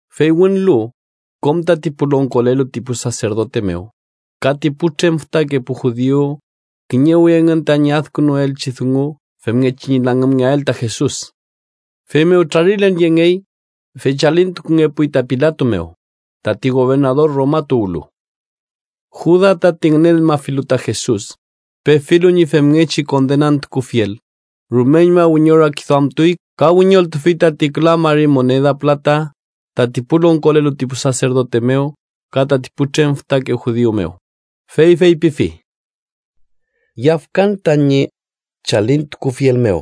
Fey wünlu, kom tati pu longkolelu ti pu saserdote mew ka ti putrem fütake pu judiu kiñewi engün tañi adkünuaelchi dungu femngechi ñi langümngeael ta Jesus. Feymew trarilen yengey, fey chalintukungepuy ta Pilato mew, tati gobernador Roma tuwlu. Juda, tati ngünenmafilu ta Jesus, pefilu ñi femngechi kondenantukufiel, rumeñma wiñorakiduamtuy ka wiñoltufi tati küla mari moneda pülata tati pu longkolelu ti pu saserdote mew ka tati putrem fütake judiu mew, fey feypifi: —Yafkan tañi chalintukufiel mew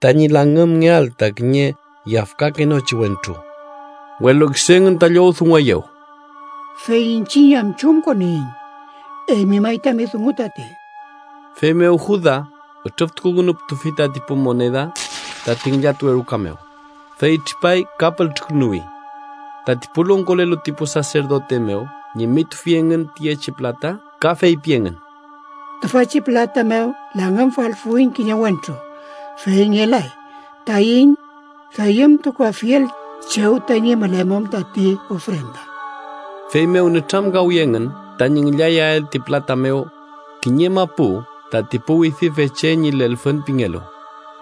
tañi langümngeael ta kiñe yafkakenochi wentru. Welu kisu engün ta llowdungueyew: —¿Fey iñchiñ am chumkoniyiñ? ¡Eymi may tami dungu tati! Feymew Juda ütrüftukukünuputufi tati pu moneda tati ngillatuwe ruka mew, fey tripay ka pültrükünuwi. Tati pu longkolelu ti pu saserdote mew ñimitufi engün tiyechi pülata ka feypi engün: “Tüfachi pülata mew langümfalfuiñ kiñe wentru, fey ngelay taiñ deyümtukuafiel chew tañi mülemum tati ofrenda.” Feymew nütramkawi engün tañi ngillayael ti pülata mew kiñe mapu tati pu Widüfe Che ñi Lelfün pingelu,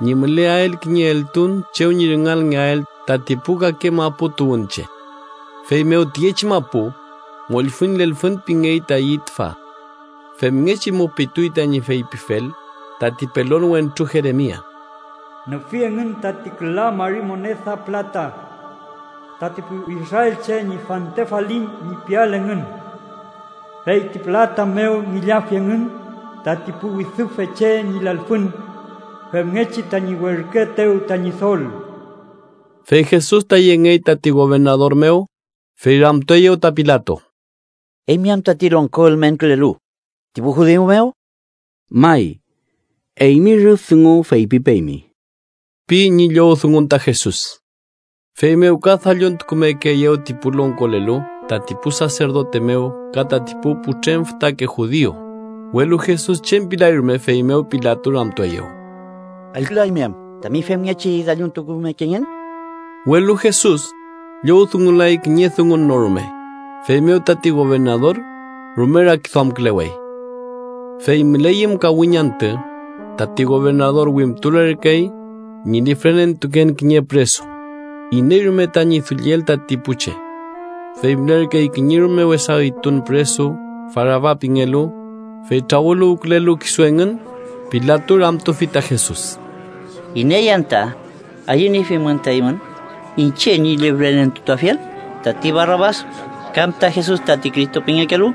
ñi müleael kiñe eltun chew ñi rüngalngeael tati pu kake mapu tuwünche. Feymew tiyechi mapu Mollfüñ Lelfün pingey tayi tüfa. Femngechi mupituy tañi feypifel tati pelon wentru Jeremia: “Nüfi engün tati küla mari moneda pülata, tati pu israelche ñi fante falin ñi piel engün, fey ti pülata mew ngillafi engün tati pu Widüfe Che ñi Lelfün, femngechi tañi werküetew ta Ñidol.” Fey Jesus ta yengey tati gobernador mew, fey ramtueyew ta Pilato: —¿Eymi am tati longko ülmenkülelu ti pu judiu mew? —May, eymi rüf dungu feypipeymi ―pi ñi llowdungun ta Jesus. Feymew ka dalluntukumekeeyew ti pu longkolelu tati pu saserdote mew ka tati pu putrem fütake judiu, welu Jesus chem pilay rume. Feymew Pilato ramtueyew: —¿Allkülaymi am tami femngechi dalluntukumekengen? Welu Jesus llowdungulay kiñe dungun no rume, feymew tati gobernador rume rakiduamkülewey. Fey müleyüm kawiñ antü, tati gobernador wimtulerkey ñi lifrenentuken kiñe püresu, iney rume tañi dulliel tati pu che. Fey mülerkey kiñe rume wesa üytun püresu Barabas pingelu, fey trawüluwkülelu kisu engün, Pilato ramtufi ta Jesus: —¿Iney anta ayüniefimün ta eymün iñche ñi lifrenentutuafiel: tati Barabas, kam ta Jesus tati Cristo pingekelu?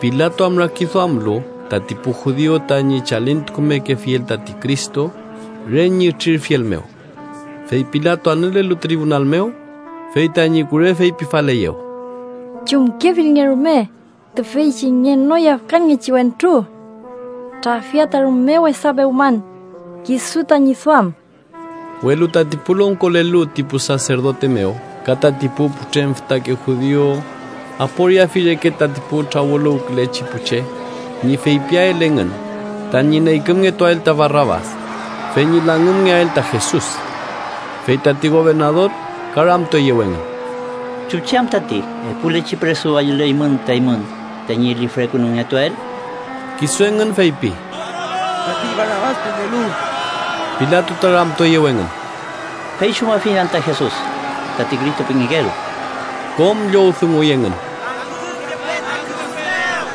Pilato am rakiduamlu tati pu judiu tañi chalintukumekefiel tati Cristo re ñi ütrirfiel mew. Fey Pilato anülelu tribunal mew, fey tañi kure feypifaleyew: “Chumkefilnge rume tüfeychi ngenoyafkanngechi wentru. Trafia ta rume wesa pewman kisu tañi duam.” Welu tati pu longkolelu ti pu saserdote mew ka tati pu putrem fütake judiu aporiafi reke tati pu trawüluwkülechi pu che ñi feypiael engün tañi neykümngetuael ta Barabas, fey ñi langümngeael ta Jesus. Fey tati gobernador ka ramtueyew engün: —¿Chuchi am tati epulechi püresu ayüleymün ta eymün tañi lifrekünungetuael? Kisu engün feypi: —¡Tati Barabas pingelu! Pilato ta ramtueyew engün: —¿Fey chumafiñ anta Jesus, tati Cristo pingekelu? Kom llowdunguy engün: —¡Langümngepe ta kürus mew!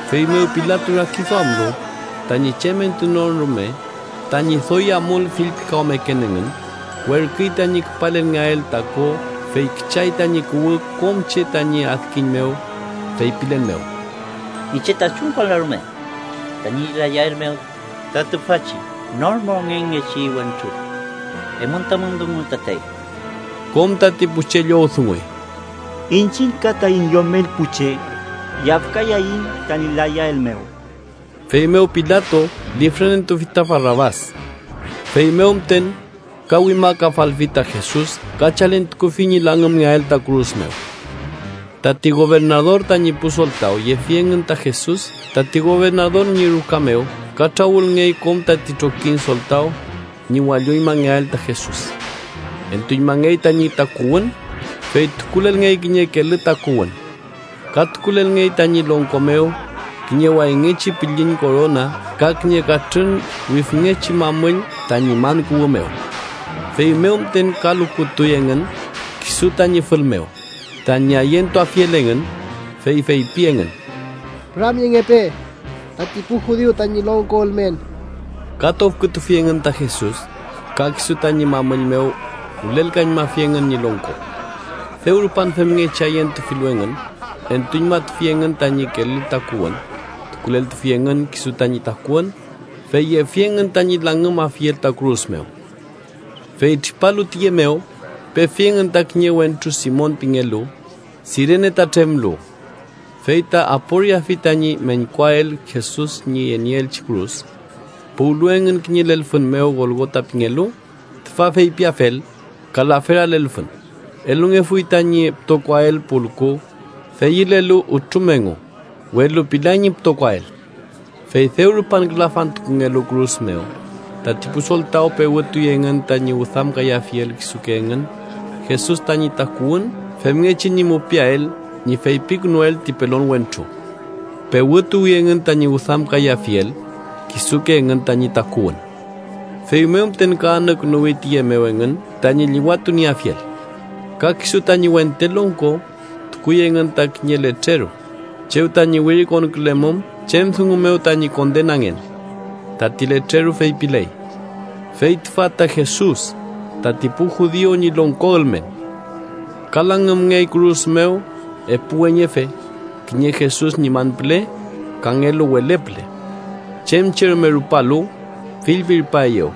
Feymew Pilato, rakiduamlu tañi chem entunon rume tañi doy amul fillpikawmeken engün, werküy tañi küpalelngeael ta ko fey küchay tañi kuwü kom che tañi adkiñ mew, feypilen mew: —Iñche ta chumkonlan rume tañi layael mew ta tüfachi nor mongenngechi wentru. Eymün tamün dungu tatey. Kom tati pu che llowdunguy: —¡Iñchiñ ka taiñ yomel pu che yafkayaiñ tañi layael mew! Feymew Pilato lifrenentutufi ta Barabas. Feymew müten ka wimakafalfi ta Jesus ka chalintukufi ñi langümngeael ta kürus mew. Tati gobernador tañi pu soltaw yefi engün ta Jesus tati gobernador ñi ruka mew ka trawülngey kom tati trokiñ soltaw ñi walloñmangeael ta Jesus. Entuñmangey tañi takuwün, fey tukulelngey kiñe kelü takuwün. Ka tukulelngey tañi longko mew kiñe wayngechi pülliñ korona ka kiñe katrün wifngechi mamüll tañi man kuwü mew. Feymew müten ka lukutuy engün kisu tañi fül mew, tañi ayentuafiel engün, fey feypi engün: —¡Püramyengepe tati pu judiu tañi longko ülmen! Ka tofkütufi engün ta Jesus, ka kisu tañi mamüll mew wülelkañmafi engün ñi longko. Dew rupan femngechi ayentufilu engün, entuñmatufi engün tañi kelü takuwün, tukuleltufi engün kisu tañi takuwün, fey yefi engün tañi langümafiel ta kürus mew. Fey tripalu tiye mew, pefi engün ta kiñe wentru Simon pingelu, Sirene ta tremlu. Fey ta aporiafi tañi meñkuael Jesus ñi yenieelchi kürus. Puwlu engün kiñe lelfün mew Golgota pingelu, tüfa feypiafel “Kalafera lelfün”, elungefuy tañi pütokoael pulku deyülelu ütrum engu, welu pilay ñi pütokoael. Fey dew rupan külafantukungelu kürus mew, tati pu soltaw pewütuy engün tañi wüdamkayafiel kisuke engün Jesus tañi takuwün femngechi ñi mupiael ñi feypikünuel ti pelon wentru: pewtuwi engün tañi wüdamkayafiel kisuke engün tañi takuwün. Feymew müten ka anükünuwi tiye mew engün tañi llüwatunieafiel. Ka kisu tañi wente longko tukuy engün ta kiñe letreru, chew tañi wirikonkülemum chem dungu mew tañi kondenangen. Tati letreru feypiley: FEY TÜFA TA JESUS, TATI PU JUDIU ÑI LONGKO ÜLMEN. Ka langümngey kürus mew epu weñefe, kiñe Jesus ñi man püle, kangelu wele püle. Chem che rume rupalu, fillpirpaeyew,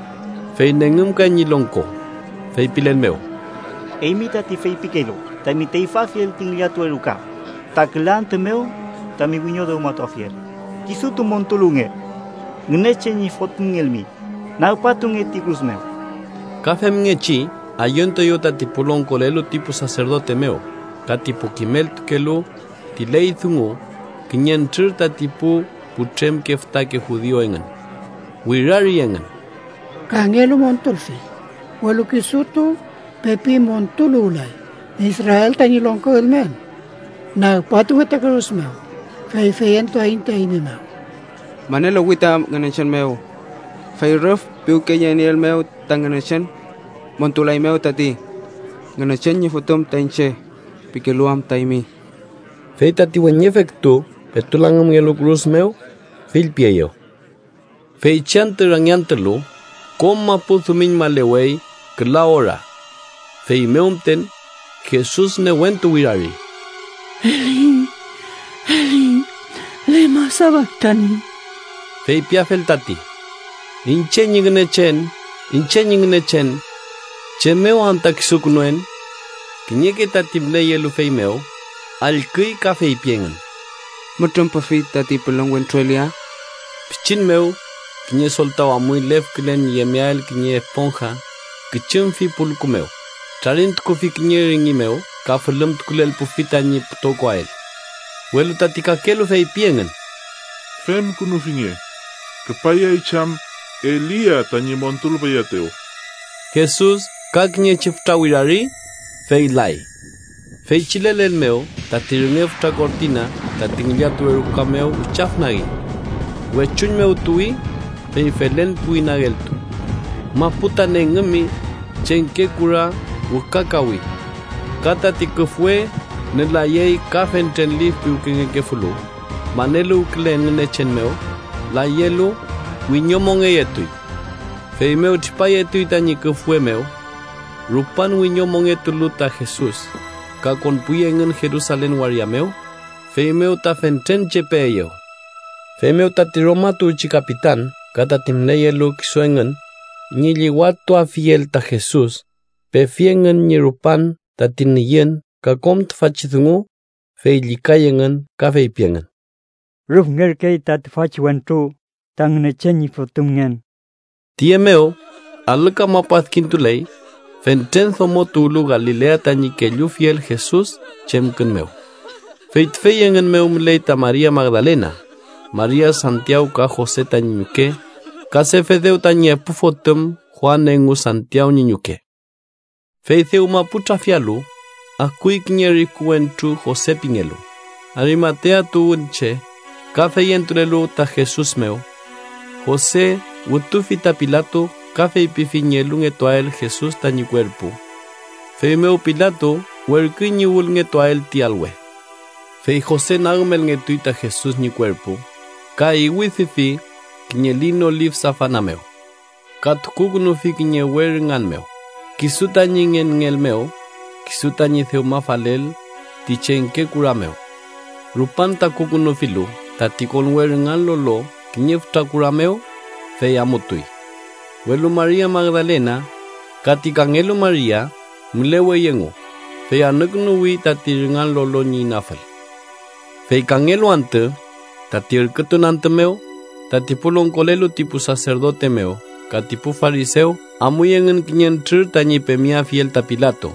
fey nengümkay ñi longko, feypilen mew: —¡Eymi, tati feypikelu tami teyfüafiel ti ngillatuwe ruka ta küla antü mew tami wiño dewmatuafiel, kisutu montuluwnge! ¡Ngünechen ñi Fotümngelmi, nagpatunge ti kürus mew! Ka femngechi ayentueyew tati pu longkolelu ti pu saserdote mew ka ti pu kimeltukelu ti ley dungu kiñentrür tati pu putremke fütake judiu engün. Wirari engün: —Kangelu montulfi, welu kisutu pepi montuluwlay. Israel tañi longko ülmen: ¡nagpatunge ta kürus mew, fey feyentuaiñ ta eymi mew! Maneluwi ta Ngünechen mew. Fey rüf piwkeyenieelmew, ta Ngünechen montulaeymew tati, Ngünechen ñi Fotüm ta iñche pikelu am ta eymi. Fey tati weñefe kütu petu langümngelu kürus mew, fillpieyew. Feychi antü rangiantülu, kom mapu dumiñmalewey küla ora. Feymew müten, Jesus newentu wirari: “Eli, Eli, ¿lema safaktani?” (Feypiafel tati: “Iñche ñi Ngünechen. Iñche ñi Ngünechen, ¿chem mew anta kisukünuen?”) Kiñeke tati müleyelu feymew, allküy ka feypi engün: mütrümpefi tati pelon wentru Elia. Pichin mew, kiñe soltaw amuy lefkülen ñi yemeael kiñe esponja, küchumfi pulku mew, trarintukufi kiñe rüngi mew ka fülümtukulelpufi tañi pütokoael. Welu tati kakelu feypi engün: —Femkünufinge, küpayay chey am Elia tañi montulpayaetew. Jesus ka kiñechi fütra wirari, fey lay. Feychi lelen mew tati rünge fütra kortina tati ngillatuwe ruka mew wichafnagi. Wechuñ mew tuwi, fey felen puwi nageltu. Mapu ta nengümi, chengke kura wükakawi. Ka tati küfwe nülayey ka fentren lif piwkengekefulu maneluwkülen Ngünechen mew, layelu, wiñomongeyetuy. Feymew tripayetuy tañi küfwe mew. Rupan wiñomongetulu ta Jesus, ka konpuy engün Jerusalen waria mew, feymew ta fentren che peeyew. Feymew tati Roma tuwchi kapitan ka tati müleyelu kisu engün ñi llüwatuafiel ta Jesus, pefi engün ñi rupan tati nüyün ka kom tüfachi dungu, fey llükay engün ka feypi engün: —¡Rüfngerkey ta tüfachi wentru ta Ngünechen ñi Fotümngen! Tiye mew, alü kamapu adkintuley fentren domo tuwlu Galilea tañi kellufiel Jesus chemkün mew. Fey tüfey engün mew müley ta Maria Magdalena, Maria Santiaw ka Jose tañi ñuke, ka Sefedew tañi epu fotüm Juan engu Santiaw ñi ñuke. Fey dewma pu trafialu, akuy kiñe riku wentru Jose pingelu, Arimatea tuwünche, ka feyentulelu ta Jesus mew. Jose wütufi ta Pilato ka feypifi ñi elungetuael Jesus tañi kuerpu. Feymew Pilato werküy ñi wülngetuael ti alwe. Fey Jose nagümelngetuy ta Jesus ñi kuerpu ka iwüdüfi kiñe lino lif safana mew. Ka tukukünufi kiñe we rüngan mew, kisu tañi ngenngeel mew, kisu tañi dewmafalel ti chengke kura mew. Rupan takukünufilu tati konwe rüngan lolo kiñe fütra kura mew, fey amutuy. Welu Maria Magdalena ka ti kangelu Maria mülewey engu, fey anükünuwi tati rüngan lolo ñi inafül. Fey kangelu antü, tati ürkütun antü mew, tati pu longkolelu ti pu saserdote mew ka ti pu farisew amuy engün kiñentrür tañi pemeafiel ta Pilato.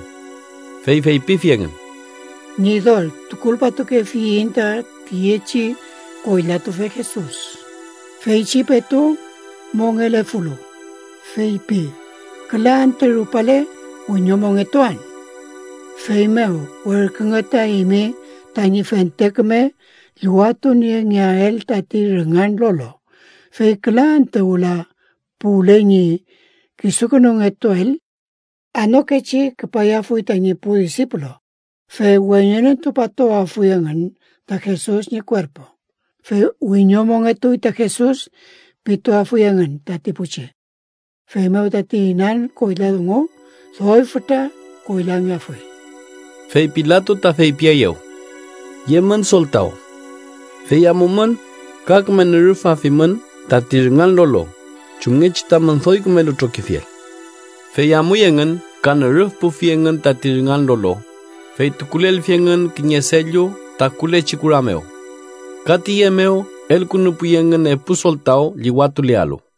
Fey feypifi engün: —Ñidol, tukulpatukefiyiñ ta tiyechi koylatufe Jesus, feychi petu mongelefulu, feypi ‘küla antü rupale, wiñomongetuan.’ Feymew, werkünge ta eymi tañi fente küme llüwatuniengeael tati rüngan lolo, fey küla antü wüla puwle ñi kisukünungetuael. Anokechi küpayafuy tañi pu disipulu, fey weñenentupatuafuy engün ta Jesus ñi kuerpu, fey “wiñomongetuy ta Jesus” pituafuy engün tati pu che. Feymew tati inan koyla dungu, doy fütra koylangeafuy. Fey Pilato ta feypieyew: —Yemün soltaw. Fey amumün ka küme nürüfafimün tati rüngan lolo chumngechi tamün doy kümelu trokifiel. Fey amuy engün ka nürüfpufi engün tati rüngan lolo, fey tukulelfi engün kiñe sello takulechi kura mew. Ka tiye mew elkünupuy engün epu soltaw llüwatulealu.